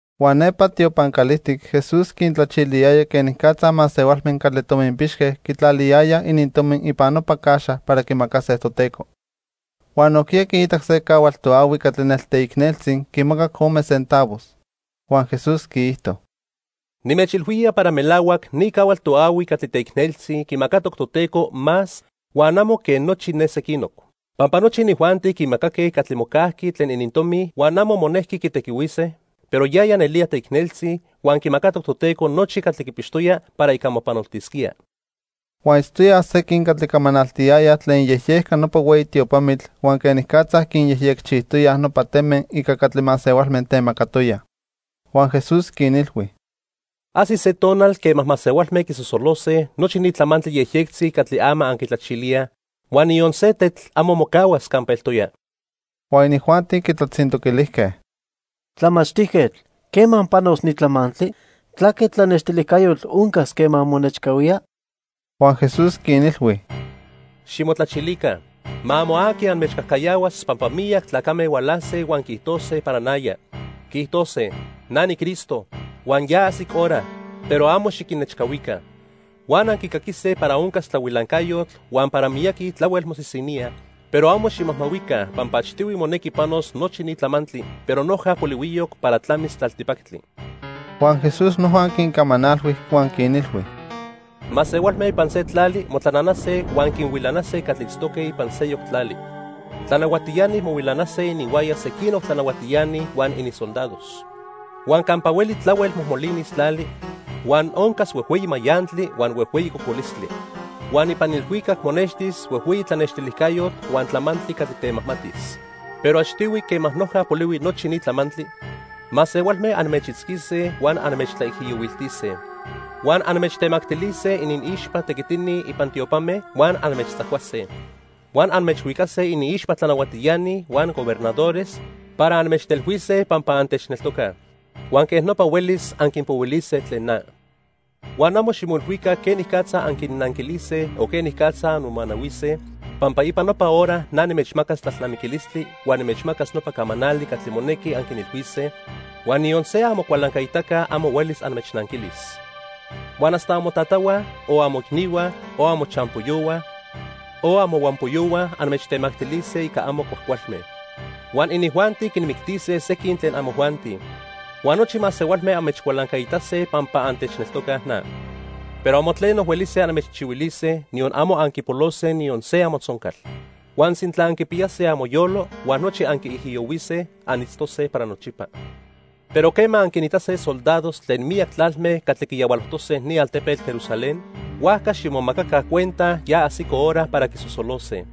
Huan nepa tiopan calijtic Jesús quintlachiliyaya quenicatza masehualme catli tominpixque quitlaliyayaj inintomi ipan nopa caxa para quimacase Toteco. Huan nojquiya quiitac se cahual toahui catli nelteicneltzi quimacac ome centavos. Huan Jesús quiijto: —Nimechilhuía para melahuac ni cahual toahui catli teicneltzi quimacatoc Toteco más huan amo quen nochi ne sequinoc. Pampa nochi inijuanti quimacaque catli mocajqui tlen inintomi huan amo monejqui quitequihuise, pero yaya nelía teicneltzi, huan quimacatoc Toteco nochi catli quipixtoya para ica mopanoltisquía. Huan itztoyaj sequin catli camanaltiyayaj tlen iyejyejca nopa hueyi tiopamitl huan quenicatza quinyejyecchijtoyaj nopa teme ica catli masehualme temacatoyaj. Huan Jesús quinilhui: —Ajsis se tonal quema masehualme quisosolose nochi ni tlamantli yejyectzi catli ama anquitlachilíaj, huan niyon se tetl amo mocahuas campa eltoya. Huan inijuanti quitlatzintoquilijque: —Tlamachtijquetl, ¿quema panos ni tlamantli? ¿Tlaque tlanextilijcayotl oncas quema monechcahuía? Huan Jesús quinilhui: "Ximotlachilica. Ma amo aqui anmechcajcayahuas pampa miyac tlacame hualase huan quiijtose para naya. Quiijtose: 'Na niCristo', huan 'Ya ajsic hora', pero amo xiquinnechcahuica. Huan anquicaquise para oncas tlahuilancayotl huan para miyaqui tlahuel mosisiníaj, pero amo ximajmahuica pampa achtihui monequi panos nochi ni tlamantli, pero noja polihuiyoc para tlamis tlaltipactli." Huan Jesús noja quincamanalhui huan quinilhui: "Masehualme ipan se tlali motlananase huan quinhuilanase catli itztoque ipan seyoc tlali. Tlanahuatiani mohuilanase ininhuaya sequinoc tlanahuatiani huan ininsoldados. Huan campa hueli tlahuel mojmolinis tlali, huan oncas huejhueyi mayantli, huan huejhueyi cocolistli. Huan ipan ilhuicac monextis huejhueyi tlanextilijcayotl huan tlamantli catli temajmatis. "Pero achtihui, quema noja polihui nochi ni tlamantli, masehualme anmechitzquise huan anmechtlaijiyohuiltise. Huan anmechtemactilise iniixpa tequitini ipan tiopame, huan anmechtzacuase. Huan anmechhuicase iniixpa tlanahuatiani huan gobernadores para anmechtelhuise pampa antechneltocaj. Huan quej nopa huelis anquinpohuilise tlen na. Huan amo ximoilhuica quenicatza anquinnanquilise o quenicatza anmomanahuise, pampa ipan nopa hora na nimechmacas tlalnamiquilistli huan nimechmacas nopa camanali catli monequi anquinilhuise, huan niyon se amocualancaitaca amo huelis anmechnanquilis. Huan hasta amotatahua, o amoicnihua, o amochampoyohua o amohuampoyohua anmechtemactilise ica amo cuajcualme. Huan inijuanti quinmictise sequin tlen amojuanti. Huan nochi masehualme anmechcualancaitase pampa antechneltocaj na. Pero amo tleno huelise anmechchihuilise, niyon amo anquipolose niyon se amotzoncal. Huan sintla anquipiyase amoyolo huan nochi anquiijiyohuise, anitztose para nochipa. "Pero quema anquinitase soldados tlen miyac tlalme catli quiyahualojtose ni altepetl Jerusalén, huajca ximomacaca cuenta ya ajsico hora para quisosolose.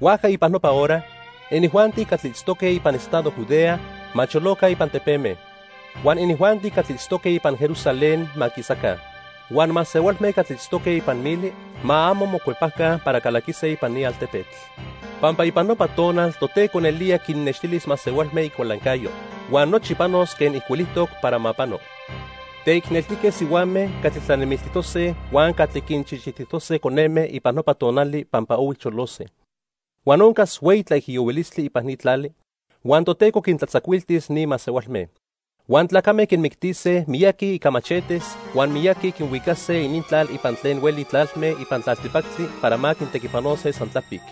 Huajca ipan nopa hora, inijuanti catli itztoque ipan estado Judea ma choloca ipan tepeme. Huan inijuanti catli itztoque ipan Jerusalén ma quisaca. Huan masehualme catli itztoque ipan mili ma amo mocuepaca para calaquise ipan ni altepetl, pampa ipan nopa tonal Toteco nelía quinnextilis masehualme icualancayo. Huan nochi panos quen ijcuilijtoc para ma pano. Teicneltique sihuame catli tlanemiltijtose huan catli quinchichitijtose coneme ipan nopa tonali pampa ohui cholose. Huan oncas hueyi tlaijiyohuilistli ipan ni tlali, huan Toteco quintlatzacuiltis ni masehualme. Huan tlacame quinmictise miyaqui ica machetes huan miyaqui quinhuicase inintlal ipan tlen hueli tlalme ipan tlaltipactli para ma quintequipanose san tlapic.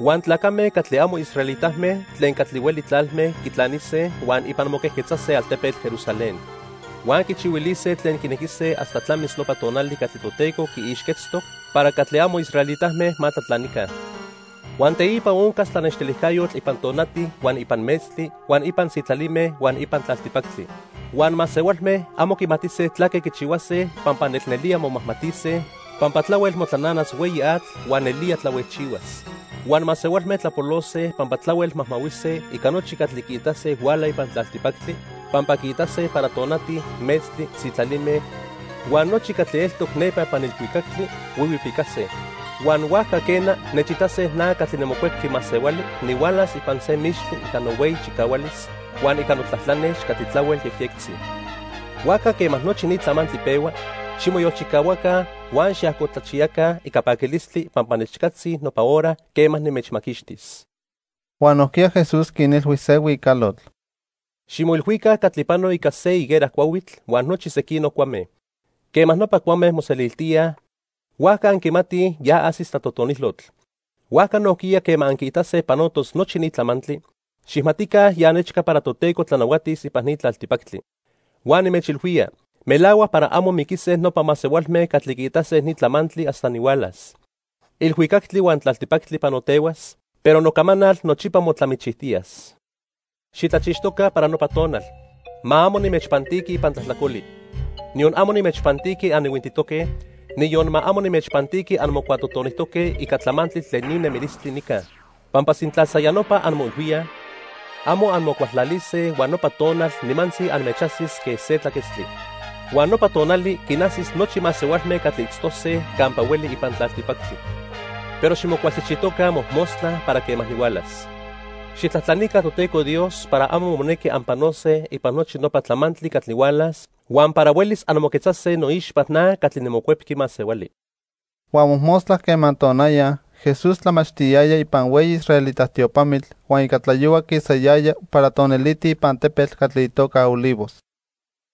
Huan tlacame catli amo israelitame tlen catli hueli tlalme quitlanise huan ipan moquejquetzase altepetl Jerusalén. Huan quichihuilise tlen quinequise hasta tlamis nopa tonali catli Toteco quiixquetztoc para catli amo israelitame ma tlatlanica. "Huan teipa oncas tlanextilijcayotl ipan tonati huan ipan metztli huan ipan sitlalime huan ipan tlaltipactli. Huan masehualme amo quimatise tlaque quichihuase pampa nelnelía momajmatise, pampa tlahuel motlananas hueyi atl huan nelía tlahuejchihuas. Huan masehualme tlapolose pampa tlahuel majmahuise ica nochi catli quiitase huala ipan tlaltipactli, pampa quiitase para tonati, metztli, sitlalime huan nochi catli eltoc nepa ipan ilhuicactli huihuipicase. Huan huajca quena, nechitase na catli niMocuepqui Masehuali nihualas ipan se mixtli ica nohueyi chicahualis, huan ica notlatlanex catli tlahuel yejyectzi. Huajca quema nochi ni tlamantli pehua, ximoyolchicahuaca huan xiajcotlachiyaca ica paquilistli pampa nechcatzi nopa hora quema nimechmaquixtis." Huan nojquiya Jesús quinilhui se huicalotl: "Ximoilhuica catli pano ica se higuera cuahuitl huan nochi sequinoc cuame. Quema nopa cuame moseliltía, huajca anquimatij ya ajsis tlatotonilotl. Huajca nojquiya quema anquiitase panotos nochi ni tlamantli, xijmatica ya nechca para Toteco tlanahuatis ipan ni tlaltipactli. "Huan nimechilhuía melahuac para amo miquise nopa masehualme catli quiitase ni tlamantli hasta nihualas. Ilhuicactli huan tlaltipactli panotehuas, pero nocamanal nochipa motlamichijtiyas. "Xitlachixtoca para nopa tonal. Ma amo nimechpantiqui ipan tlajtlacoli. Niyon amo nimechpantiqui anihuintitoque, niyon ma amo nimechpantiqui anmocuatotonijtoque ica tlamantli tlen ni nemilistli nica. Pampa sintla san ya nopa anmoilhuíaj, amo anmocualtlalise huan nopa tonal nimantzi anmechajsis quen se tlaquetztli. Huan nopa tonali quinajsis nochi masehualme catli itztose campa hueli ipan tlaltipactli. Pero ximocualchijchijtoca mojmostla para quema nihualas. Xijtlajtlanica Toteco Dios para amo monequi anpanose ipan nochi nopa tlamantli catli hualas huan para huelis anmoquetzase noixpa na catli niMocuepqui Masehuali." Huan mojmostla quema tonaya, Jesús tlamachtiyaya ipan hueyi israelita tiopamitl huan ica tlayohua quisayaya para toniliti ipan tepetl catli itoca Olivos.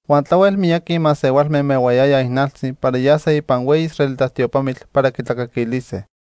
Huan tlahuel miyaqui masehualme mehuayayaj ijnaltzi para yase ipan hueyi israelita tiopamitl para quitlacaquilise.